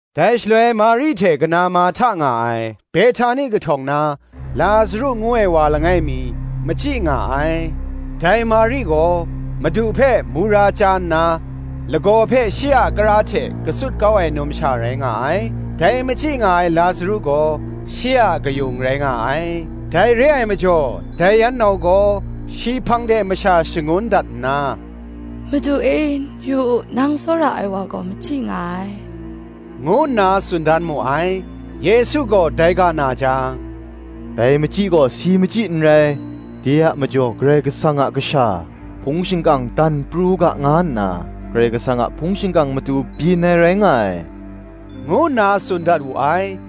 Dai shaloi Mari hte kana Marhta nga ai Behtani kahtawng na, Lazaru ngu ai wa langai mi, machyi nga ai. Dai Mari gaw Madu hpe mura chya nna, lagaw hpe shi a kara hte katsut kau ai numsha rai nga ai: dai machyi nga ai Lazaru gaw, shi a kayung rai nga ai. Dai re ai majaw dai yan nau gaw shi hpang de masha shangun dat nna, “Madu e, yu u, nang tsawra ai wa gaw machyi nga ai,” ngu nna tsun dan mu ai. Yesu gaw dai ga na jang, “Dai machyi gaw si machyi n rai: de a majaw Karai Kasang a Kasha hpung shingkang dan pru u ga nga nna, Karai Kasang a hpung shingkang matu byin ai rai nga ai,” ngu nna tsun dat wu ai.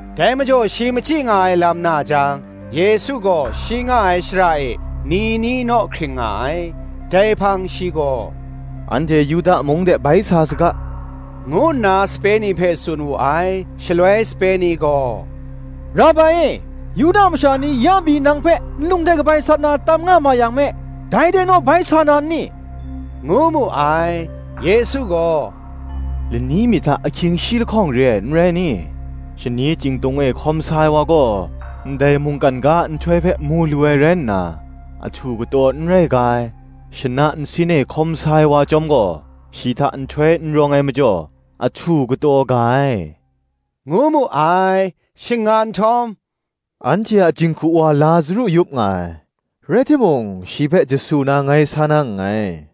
Dai majaw shi machyi nga ai lam na jang, Yesu gaw shi nga ai shara e ni ni naw hkring nga ai. Dai hpang shi gaw, Anhte Yuda mung de bai sa saga,” ngu nna sape ni hpe tsun wu ai. Shaloi sape ni gaw, “Rabai e, Yuda masha ni ya pyi nang hpe nlung hte kabai sat na tam nga ma yang me, dai de naw bai sa na nni?” ngu mu ai. Yesu gaw, “Lani mi hta ahkying shi lahkawng re ai, n rai ni? Shani chyingtung e hkawm sa ai wa gaw, ndai mungkan ga a nhtoi hpe mu lu ai rai nna, ahtu kataw n rai ga ai: shana nsin e hkawm sa ai wa chyawm gaw, shi hta nhtoi n rawng ai majaw, ahtu kataw ga ai,” ngu mu ai. Shing nga nhtawm, “Anhte a jinghku wa Lazaru yup nga ai: rai timung, shi hpe jasu na ngai sa na nngai,”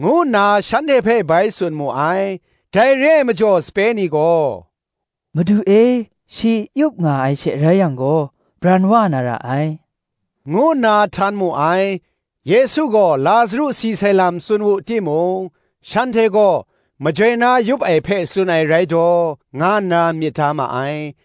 ngu nna shanhte hpe bai tsun mu ai. Dai re ai majaw sape ni gaw, “Madu e, shi yup nga ai she rai yang gaw, bran wa na ra ai,” ngu nna htan mu ai. Yesu gaw Lazaru si sai lam tsun wu timung, shanhte gaw majoi na yup ai hpe tsun ai rai daw, nga nna myit ma ai.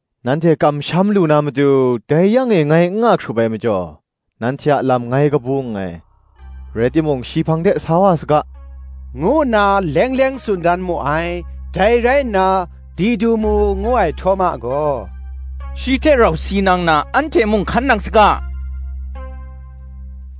nanhte kamsham lu na matu, dai yang e ngai n nga hkrup ai majaw, nanhte a lam ngai kabu nngai: rai timung shi hpang de sa wa saga,” ngu nna leng leng tsun dan mu ai. Dai rai nna Didumu ngu ai Htawma gaw, “Shi hte rau si nang na, anhte mung hkan nang saga,”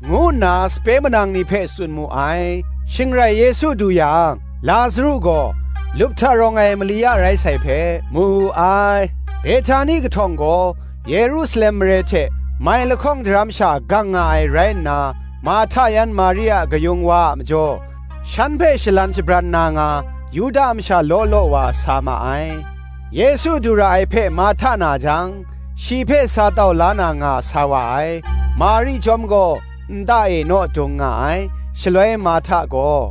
ngu nna sape manang ni hpe tsun mu ai. Shing rai Yesu du yang, Lazaru gaw lup hta rawng ai mali ya rai sai hpe, mu wu ai. Behtani kahtawng gaw Yerusalem mare hte mai lahkawng daram sha gang nga ai rai nna, Marhta yan Mari a kayung wa a majaw, shan hpe shalan shabran na nga, Yuda masha law law wa sa ma ai. Yesu du ra ai hpe Marhta na jang, shi hpe sa tau la na nga sa wa ai: Mari chyawm gaw nta e naw dung nga ai. Shaloi Marhta gaw,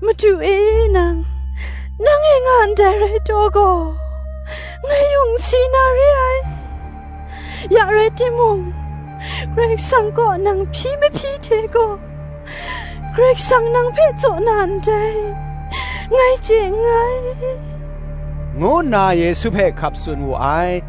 “Madu e, nang nang e nga ndai rai taw gaw, ngai yung n si na re ai. Ya rai timung Karai Kasang kaw nang hpyi mahpyi hte gaw, Karai Kasang nang hpe jaw na ndai ngai chye nngai,” ngu nna Yesu hpe hkap tsun wu ai.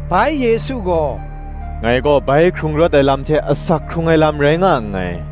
Bai Yesu gaw, “Ngai gaw bai hkrung rawt ai lam hte asak hkrung ai lam rai nga nngai: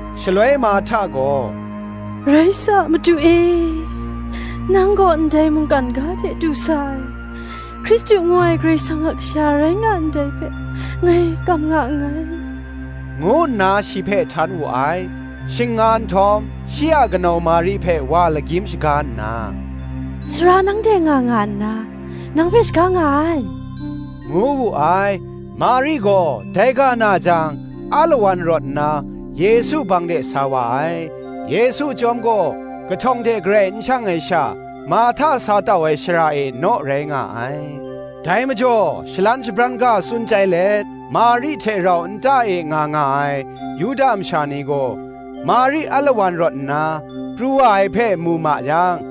Shaloi Marhta gaw, “Rai sa, Madu e, nang gaw ndai mungkan ga de du sa sai, Hkristu ngu ai Karai Kasang a Kasha rai nga ndai hpe, ngai kam nga nngai,” ngu nna shi hpe htan wu ai. Shing nga nhtawm shi a kanau Mari hpe wa lagyim shaga nna, “Sara nang de nga nga nna, nang hpe shaga nga ai,” ngu wu ai. Mari gaw dai ga na jang alawan rawt nna Yesu hpang de sa wa ai. Yesu chyawm gaw kahtawng de garai n shang ai sha, Marhta sa tau ai shara e naw rai nga ai. Dai majaw shalan shabran ga tsun chyai let, Mari hte rau nta e nga nga ai Yuda masha ni gaw, Mari alawan rawt nna pru wa ai hpe mu ma yang,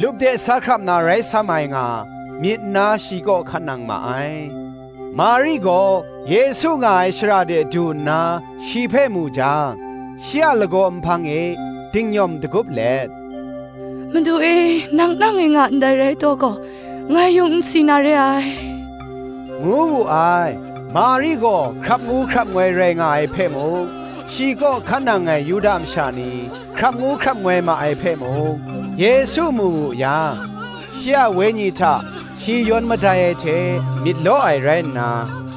lup de sa hkrap na rai sam ai nga, myit nna shi kaw hkan nang ma ai. Mari gaw Yesu nga ai shara de du nna shi hpe mu jang, shi a lagaw nhpang e dingnyawm dagup let, “Madu e, nang nang e nga ndai rai taw gaw, ngai yung n si na re ai,” ngu wu ai. Mari gaw hkrap ngu hkrap ngoi rai nga ai hpe mung, shi kaw hkan nang ai Yuda masha ni hkrap ngu hkrap ngoi ma ai hpe mung, Yesu mu wu yang, shi a wenyi hta shi yawn madai ai hte, myit law ai rai nna,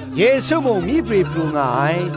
Yesu mung myi prwi pru nga ai.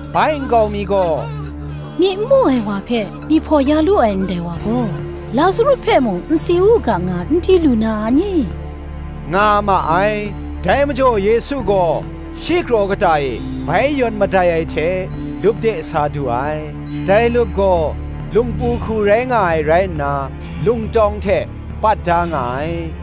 Bai nkau mi gaw, “Myi n mu ai wa hpe myi hpaw ya lu ai, ndai wa gaw, Lazaru hpe mung n si u ga nga, n di lu na a ni?” nga ma ai. Dai majaw Yesu gaw shi kraw kata e bai yawn madai ai hte lup de sa du ai: dai lup gaw lungpu hku rai nga ai rai nna, lung tawng hte pat da nga ai.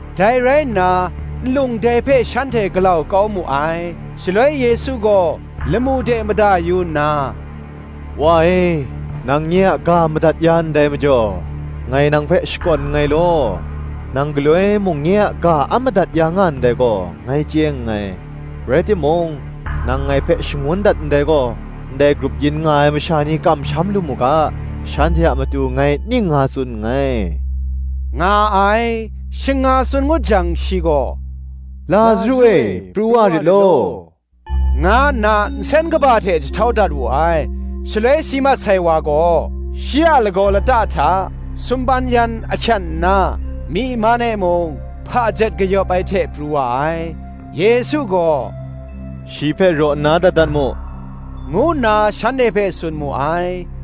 Dai rai nna nlung dai hpe shanhte galau kau mu ai. Shaloi Yesu gaw lamu de mada yu nna, “Wa e, nang nye a ga madat ya ndai majaw, ngai nang hpe shakawn nngai law. Nang galoi mung nye a ga a madat ya nga ndai gaw, ngai chye nngai; rai timung, nang ngai hpe shangun dat ndai gaw, ndai grup yin nga ai masha ni kamsham lu mu ga, shanhte a matu ngai ning nga tsun nngai,” nga ai. Shing nga tsun ngut jang shi gaw, “Lazaru e, pru wa rit law,” nga nna nsen kaba hte jahtau dat wu ai. Shaloi si mat sai wa gaw, shi a lagaw lata hta sumpan yan ahkyen nna, myi man e mung hpajet kayawp ai hte pru wa ai, Yesu gaw, “Shi hpe raw nna dat dat mu,” ngu nna shanhte hpe tsun mu ai.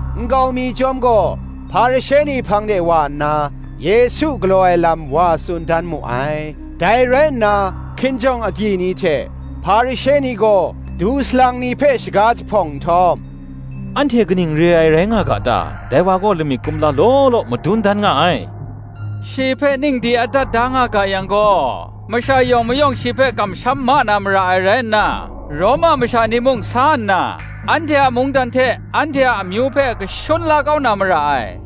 Nkau mi chyawm gaw, Hparishe ni hpang de wa nna, Yesu galaw ai lam wa tsun dan mu ai. Dai rai nna hkinjawng agyi ni hte Hparishe ni gaw, du salang ni hpe shaga jahpawng nhtawm, “Anhte kaning re ai rai nga ga ta? dai wa gaw lamik kumla law law madun dan nga ai. Shi hpe ning di adat da nga ga yang gaw, masha yawng mayawng shi hpe kamsham ma na mara ai rai nna, Roma masha ni mung sa nna, anhte a mungdan hte anhte a amyu hpe kashun la kau na mara ai,”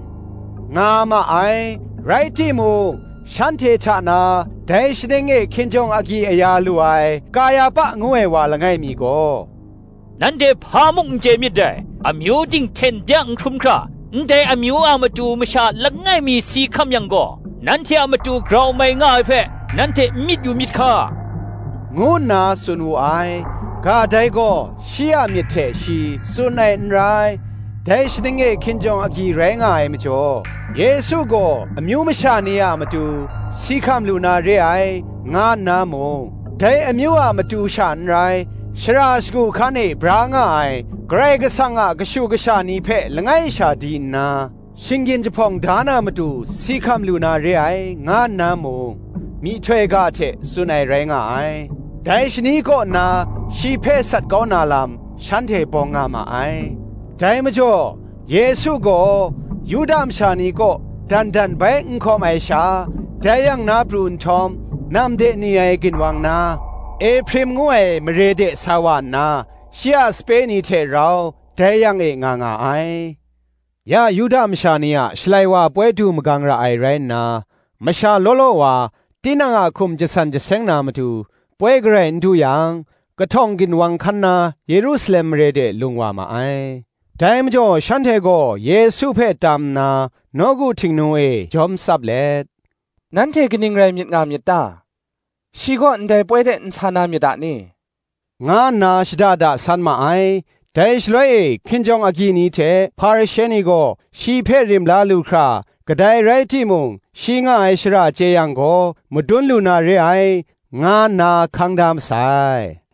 nga ma ai. Rai timung, shanhte hta na, dai shaning e hkinjawng agyi aya lu ai, Kayahpa ngu ai wa langai mi gaw, “Nanhte hpa mung n chye myit dai: amyu ting hten bya n hkrum hkra, ndai amyu a matu masha langai mi si hkam yang gaw, nanhte a matu grau mai nga ai hpe, nanhte n myit yu myit hka,” ngu nna tsun wu ai. Ga dai gaw shi a myit hte shi tsun ai n rai: dai shaning e hkinjawng agyi rai nga ai majaw, Yesu gaw amyu masha ni a matu si hkam lu na re ai, nga nna mung, dai amyu a matu sha n rai, shara shagu hkan e bra nga ai, Karai Kasang a kashu kasha ni hpe langai sha di nna, shinggyin jahpawng da na matu si hkam lu na re ai, nga nna mung, myihtoi ga hte tsun ai rai nga ai. Dai shani kaw nna shi hpe sat kau na lam shanhte bawng nga ma ai. Dai majaw Yesu gaw Yuda masha ni kaw, dan dan bai n hkawm ai sha, dai yang na pru nhtawm, nam de ni ai ginwang na Ehprim ngu ai mare de sa wa nna, shi a sape ni hte rau dai yang e nga nga ai. Ya Yuda masha ni a Shalai wa ai poi du magang ra ai rai nna, masha law law wa tinang a hkum jasan jaseng na matu, poi garai n du yang, kahtawng ginwang hkan na Yerusalem mare de lung wa ma ai. Dai majaw shanhte gaw Yesu hpe tam nna, nawku Htingnu e jawm tsap let, “Nanhte kaning rai myit nga myit ta? Shi gaw ndai poi de n sa na myit a ni?” nga nna shada da san ma ai. Dai shaloi e hkinjawng agyi ni hte Hparishe ni gaw, shi hpe rim la lu hkra, kadai rai timung shi nga ai shara chye yang gaw, madun lu na re ai, nga nna hkang da masai.